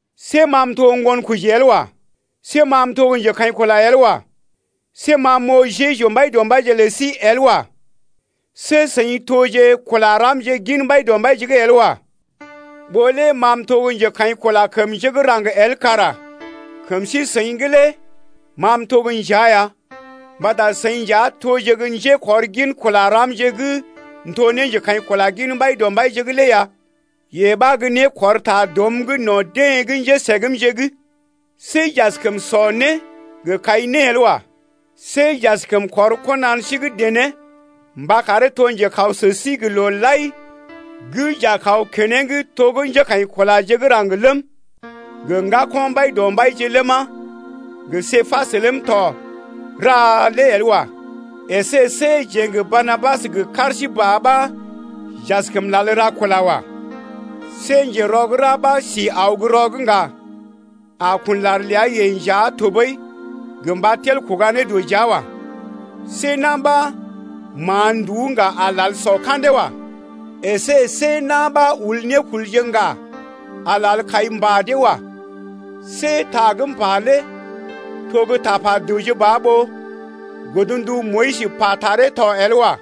See ma m’to ŋgonkoji el wa. See ma m’to gə́ njekaḭkula el wa. See ma m’oo Jeju Mbaidɔmbaije lə sí el wa. See seḭ toje kula ramje gin Mbaidɔmbaije’g el wa. Ɓó lé ma m’to gə́ njekaḭkula kəm njé gə́ raŋg el kara kəm sí-seḭ’g lé ma m’to gə́ njea ya. Mbata seḭ nja toje gə́ njékɔrgin kula ramje gə́ m’to ne njekaḭkula gin Mbaidɔmbaije’g lé ya. Yee ɓa gə́ né kɔr ta dɔm’g no̰ deḛ gə́ njésəgmje’g. See j’askəm sɔ né gə kai né el wa. See j’askəm kɔr kɔnan sí gə́ dené mba karee to njekaw sə sí gə looje lai gə́ j’a kaw keneŋ to gə́ njékaḭkulaje gə́ raŋg ləm, gə ŋgako̰ Mbaidɔmbaije ləma, gə Képas ləm tɔ ra lé el wa. Esé see jeḛ gə Barnabas gə kar sí ba ɓa j’askəm lal ra kula el wa. See njerɔ gə́ ra ɓa si aw gə́ rɔ’g ŋga a kun lar ləa-yeḛ nja tɔɓəi gə mba tel kuga né dɔ jia wa. See na̰ ɓa ma̰a nduú ŋga a lal sɔ ka̰dee wa. Esé see na̰ ɓa ul nékulje ŋga a lal kai mbà dee wa. See ta gə́ m’pa lé to gə́ tapa dəwje ba ɓó godndu Moyis pa taree tɔ el wa.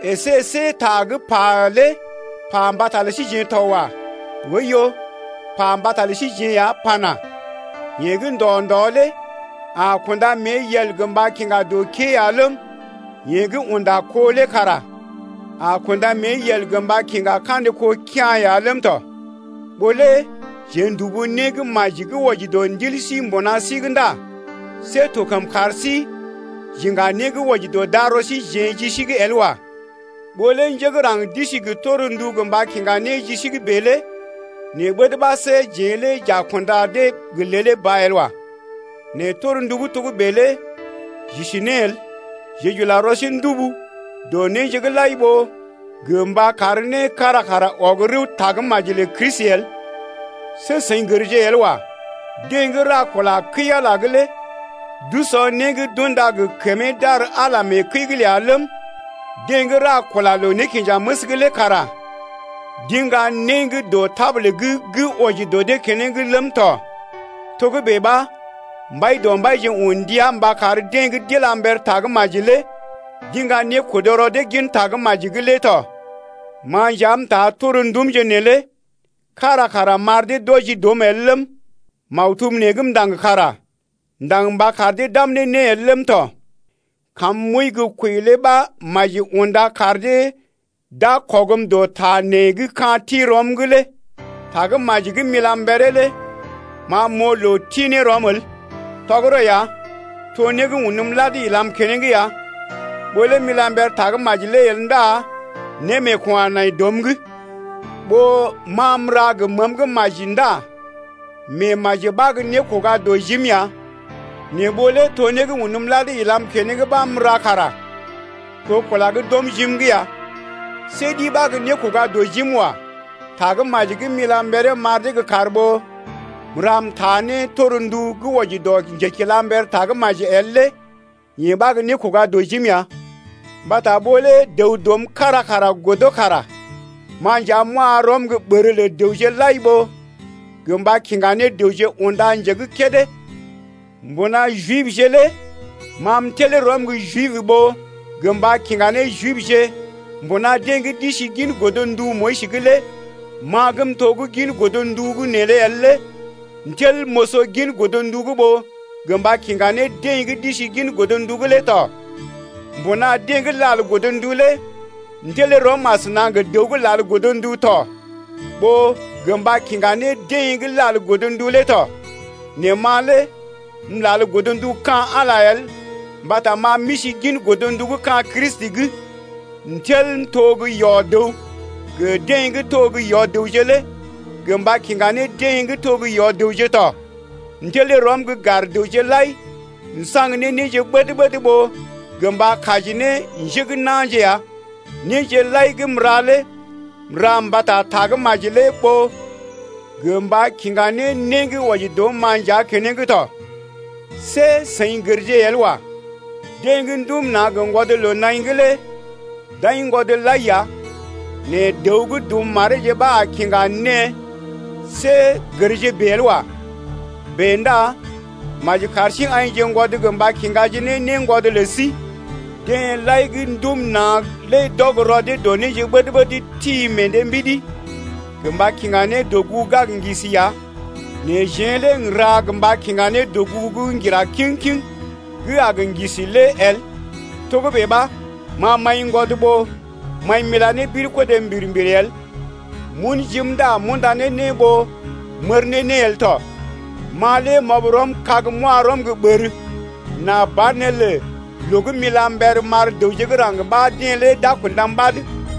Esé see ta gə́ pa lé pa mbata lə síjeḛ to wa. Oiyo, pa mbata lə síjeḛ ya pana: Yeḛ gə́ ndɔ-ndɔ lé a kunda mée yel gə mba kiŋga dɔ kée ya ləm, yeḛ gə́ unda kó lé kara a kunda mée yel gə mba kiŋga kandə kó kea̰ ya ləm tɔ. Ɓó lé jeḛ n’dubu né gə́ maji gə́ wɔji dɔ ndil sí mbuna sí’g ndá see to kəm kar sí j’iŋga né gə́ wɔji dɔ darɔ síjeḛ ji sí’g el wa. Ɓó lé njé gə́ raŋg d’isi gə torndu gə mba kiŋga ne ji sí’g bèe lé nɛ ɓəd ɓa see jeḛ lé j’a kunda dee gə lèlé ba el wa. Nɛ torndu gə́ togə́bè lé j’isi ne el, jeḛ j’ula rɔ sí ndubu dɔ néje’g lai ɓó gə mba kar né kára kara ɔg rəw tagə́maji lə Kristi el. See seḭ gərje el wa, deḛ gə́ ra kula kəi-Ala’g lé d’usɔ né gə́ d’unda gə kəmee d’ar Ala mee kəi’g ləa ləm, deḛ gə́ ra kula loo-nékinjaməs’g lé kara d’iŋga né gə́ dɔ tabul’g gə́ wɔji dɔ dee keneŋ ləm tɔ. Togə́bè ɓa Mbaidɔmbaije un ndia mba kar deḛ gə́ d’ila mber Tagə́maji lé d’iŋga nékodo rɔ dee gin Tagə́maji’g lé tɔ. Ma nja m’taa torndumje neelé kára kara m’ar dee d’wɔji dɔm el ləm, maktub nee gə́ m’ndaŋg kara m’ndaŋg mba kar dee d’am ne né el ləm tɔ. Kam m’wəi gə́ kwəi lé ɓa maji unda kar dee d’a kɔgm dɔ ta nee gə́ ka̰ ti rɔm lé. Tagə́maji gə́ m’ila mberee lé ma m’oo loo ti ne rɔm el. Tɔgərɔ ya, to né gə́ unm lad ilam keneŋ ya. Ɓó lé m’ila mber Tagə́maji lé el ndá némeeko̰ a nai dɔm’g. Ɓó ma m’ra gə məəm gə́ maji ndá meemaji ɓa gə́ nékoga dɔ jim ya. Nɛ ɓó lé to né gə́ unm lad ilam keneŋ ɓa m’ra kara to kula gə́ d’ɔm jim’g ya. See ɗi ɓa gə́ nékoga dɔ jim wa. Tagə́maji gə́ m’ila mberee m’ar dee gə́ kar ɓó m’ra m’taa ne torndu gə́ wɔji dɔ njekilamber Tagə́maji’g el lé yee ɓa gə́ nékoga dɔ jim ya. Mbata ɓó lə dəw dɔm kára kara godo kara ma nja m’wa rɔm gə́ ɓər lə dəwje lai ɓó gə mba kiŋga ne dəwje unda nje gə́ kédé. Mbuna Jibje lé ma m’tel rɔm gə́ Jib ɓó gə mba kiŋga ne Jibje. Mbuna deḛ gə́ d’isi gin godndu Moyis’g lé ma gə́ m’to gə́ gin godndu’g neelé el lé m’tel m’oso gin godndu’g ɓó gə mba kiŋga ne deḛ gə́ d’isi gin godndu’g lé tɔ. Mbuna deḛ gə́ lal godndu lé m’tel rɔm asəna gə dəw gə́ lal godndu tɔ, ɓó gə mba kiŋga ne deḛ gə́ lal godndu lé tɔ, nɛ ma lé m’lal godndu gə́ ka̰ Ala el mbata ma m’isi gin godndu gə́ ka̰ Kristi’g. M’tel m’to gə́ yɔ-dəw gə deḛ gə́ to gə́ yɔ-dəwje lé gə mba kiŋga ne deḛ gə́ to gə́ yɔ-dəwje lé tɔ. M’tel rɔm gə́ gar dəwje lai m’saŋg ne néje ɓəd-ɓəd ɓó gə mba kaji ne njé gə́ na̰je ya. Néje lai gə́ m’ra lé m’ra mbata Tagə́maji lé ɓó gə mba kiŋga ne né gə́ wɔji dɔm-ma nja keneŋ tɔ. See seḭ gərje el wa. Deḛ gə́ ndum na̰ gə ŋgwɔd loo-naḭ’g lé d’aiŋgwɔd lai ya nɛ dəw gə́ dum mareeje ɓa a kiŋga née, see gərje bèe el wa. Bèe ndá maji kar sí aḭjḛgwɔd gə mba kiŋga ne néngwɔd lə sí. Deḛ lai gə́ ndum na̰ lé d’ɔg rɔ dee dɔ néje’g ɓəd-ɓəd ti meḛ dee mbidi gə mba kiŋga ne dɔgugu gə́ a gə ŋgisi ya. Nɛ jeḛ lé n’ra gə mba kiŋga ne dɔgugu gə́ ŋgira kiŋ-kiŋ gə́ a gə ŋgisi el lé. Togə́bè ɓa ma m’aiŋgwɔd ɓó m’aḭ m’ila ne birkodé mbir-mbir el, m’un jim ndá m’unda ne né ɓó m’ər ne né el tɔ. Ma lé m’ɔb rɔm kag m’wa rɔm gə́ ɓər, nà banelə loo gə́ m’ila mber m’ar dəwje gə́ raŋg ɓa dee lé d’a kundam ɓad.